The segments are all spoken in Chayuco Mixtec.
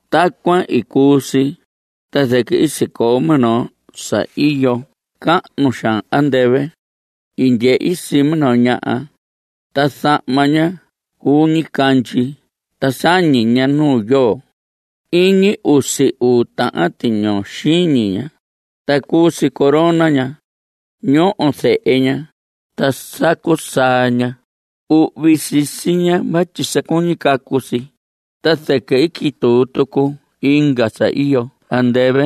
Tacuan i cuu si, ta zɨquɨ i sicoo minoo sa iyo cahnu xaan andɨvɨ. I ndyehi sii minoo ñaha, ta zahma ña cuu ñicandyi ta sañi ña nu yoo. Iñi usi uu tahan tiñoo xiñi ña, ta cuu si corona ña. Ñoho zehe ña, ta sacu saa ña. Uhvi sisi ña vatyi sa cuñi cacu si. Ta zɨquɨ i quituu tucu inga sa iyo andɨvɨ.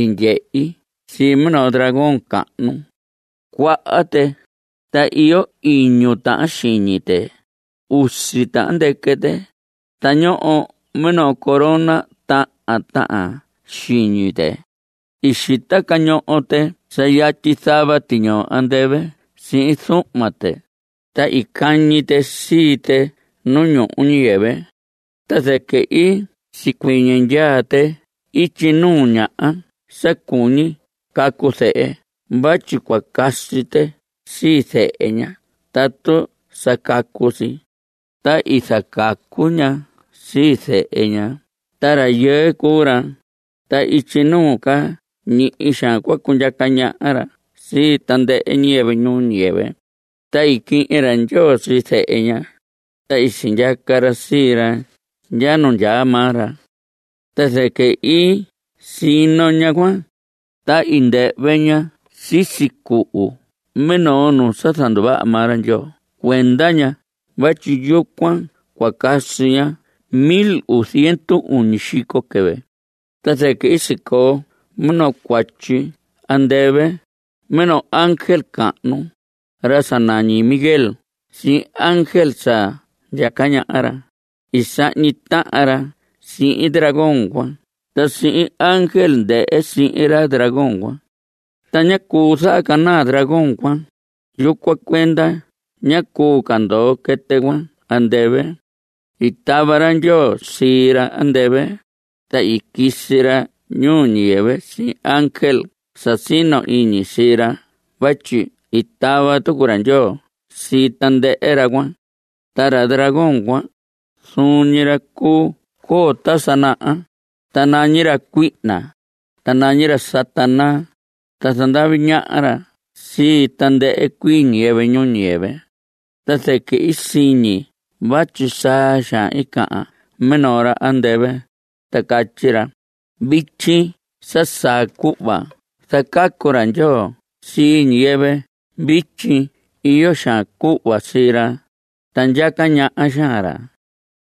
I ndyehi sii minoo dragón cahnu. Cuaha tɨ, ta iyo iñu tahan xiñi tɨ. Usi tahan ndɨquɨ tɨ. Ta ñoho minoo corona tahan tahan xiñi tɨ. I xita cañoho tɨ sa yatyi zava tiñoo andɨvɨ sihin zuhma tɨ, ta i cañi tɨ sii tɨ nu ñuhu ñuu ñiyɨvɨ. Ta zɨquɨ i sicuɨñɨ ndyaa tɨ ityi nuu ñaha sa cuñi cacu zehe vatyi cua casi tɨ sii zehe ña tatu sa cacu si. Ta i zacacu ña sii zehe ña, ta rayɨɨ cuu ra, ta ityi nuu ca ñihi xaan cua cundyaca ñaha ra sii tandɨhɨ ñiyɨvɨ ñuu ñiyɨvɨ. Ta i quihin ra Ndyoo sii zehe ña, ta i sindyaca ra sii ra ndya nu ndyaa maa ra. Ta zɨquɨ i sino ñaha cuan, ta i ndɨhvɨ ña sisi cuhu minoo nu sa i zanduvaha maa ra Ndyoo cuenda ña vatyi yucuan cua casi ña mil uu ziendu uñi xico quɨvɨ. Ta zɨquɨ i sicoo minoo cuatyi andɨvɨ. Minoo ángel cahnu, ra sa nañi Miguel sihin ángel sa ndyaca ñaha ra, i sahñi tahan ra sihin dragón cuan ta sihin ángel ndɨhɨ sihin ra dragón cuan. Ta ñá cuu zahacanaa dragón cuan. Yucuan cuenda ñá cuu ca ndoo quɨtɨ cuan andɨvɨ. I tava ra Ndyoo sii ra andɨvɨ, ta i quisi ra ñuu ñiyɨvɨ sihin ángel sa sino iñi sii ra vatyi i tava tucu ra Ndyoo sii tandɨhɨ ra cuan. Ta ra dragón cuan, zuun ñi ra cuu coo ta sa naha, ta nañi ra cuihna, ta nañi ra Satanás, ta zandavi ñaha ra sii tandɨhɨ cuii ñiyɨvɨ ñuu ñiyɨvɨ. Ta zɨquɨ i siñi vatyi saa xaan cahan minoo ra andɨvɨ, ta catyi ra: Vityi sa saa cuhva zacacu ra Ndyoo sii ñiyɨvɨ. Vityi iyo xaan cuhva sii ra, ta ndyaca ñaha xaan ra,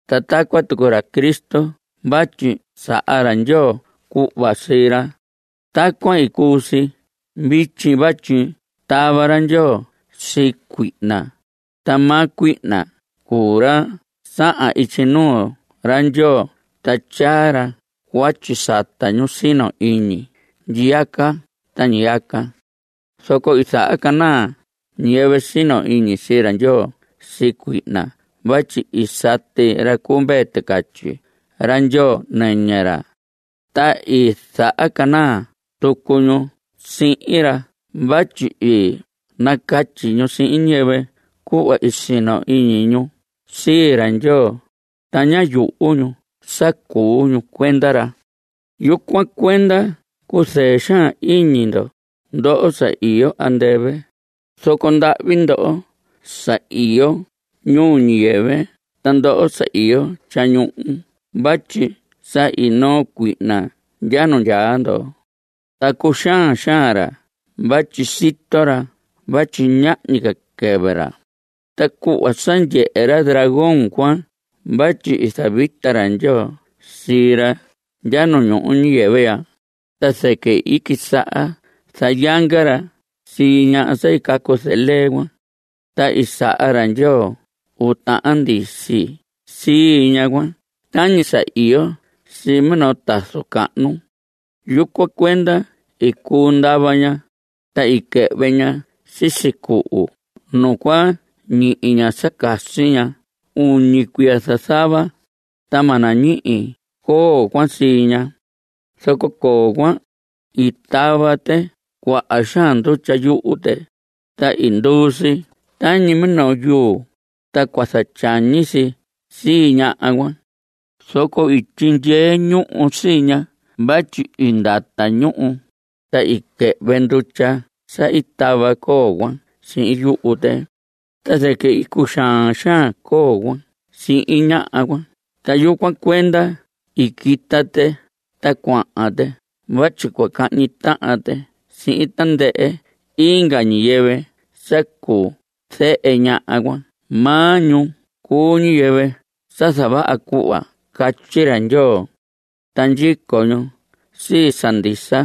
ta tacuan tucu ra Cristo vatyi saha xaan ra Ndyoo cuhva sii ra. Tacuan cuu si vityi vatyi i tava ra Ndyoo sii cuihna, ta maa cuihna cuu ra sahan ityi nuu ra Ndyoo ta tyaa ra cuatyi sata ñu sino iñi ndyiyaca ta ñiyaca. Zoco i zahacanaa ñiyɨvɨ sino iñi sii ra Ndyoo sii cuihna vatyi i sati ra cu Mvee Ticatyi ra Ndyoo nɨñɨ ra. Ta i zahacanaa tucu ñu sii ra vatyi i nacatyi ñu sihin ñiyɨvɨ cuhva i sino iñi ñu sii ra Ndyoo, ta ñá yuhu ñu sa cuu ñu cuenda ra. Yucuan cuenda cuzɨɨ xaan iñi ndo, ndoho sa iyo andɨvɨ, zoco ndahvi ndoho sa iyo ñuu ñiyɨvɨ ta ndoho sa iyo tyañuhu vatyi sa i noo cuihna ndya nu ndyaa ndo. Ta cuxaan xaan ra vatyi sito ra vatyi ñahñi ca quɨvɨ ra. Ta cuhva sa ndyehe ra dragón cuan vatyi i zavita ra Ndyoo sii ra ndya ñuu ñiyɨvɨ ya, ta zɨquɨ i quisaha zayanga ra sii ñaha sa i zacacu sii lee cuan. Ta i saha ra Ndyoo uu tahan ndisi sii ñaha cuan tañi sa iyo sii minoo tazu cahnu. Yucuan cuenda i cuu ndava ña, ta i quɨhvɨ ña sisi cuhu nu cua ñihi ña sa casi ña uñi cuiya zazava, ta ma nañihi coo cuan sii ña. Zoco coo cuan, i tava tɨ cuaha xaan ndutya yuhu tɨ, ta i nduu si tañi minoo yuu, ta cua zatyañi si sii ñaha cuan. Zoco i tyindyee ñuhu sii ña vatyi i ndata ñuhu, ta i quɨhvɨ ndutya sa i tava coo cuan sihin yuhu tɨ. Ta zɨquɨ i cuxaan xaan coo cuan sihin ñaha cuan, ta yucuan cuenda i quita tɨ ta cuahan tɨ vatyi cua cahñi tahan tɨ sihin tandɨhɨ inga ñiyɨvɨ sa cuu zehe ñaha cuan. Maa ñu cuu ñiyɨvɨ sa zavaha cuhva catyi ra Ndyoo. Ta ndyico ñu sii sa ndisa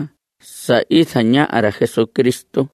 sa i zañaha ra Jesucristo.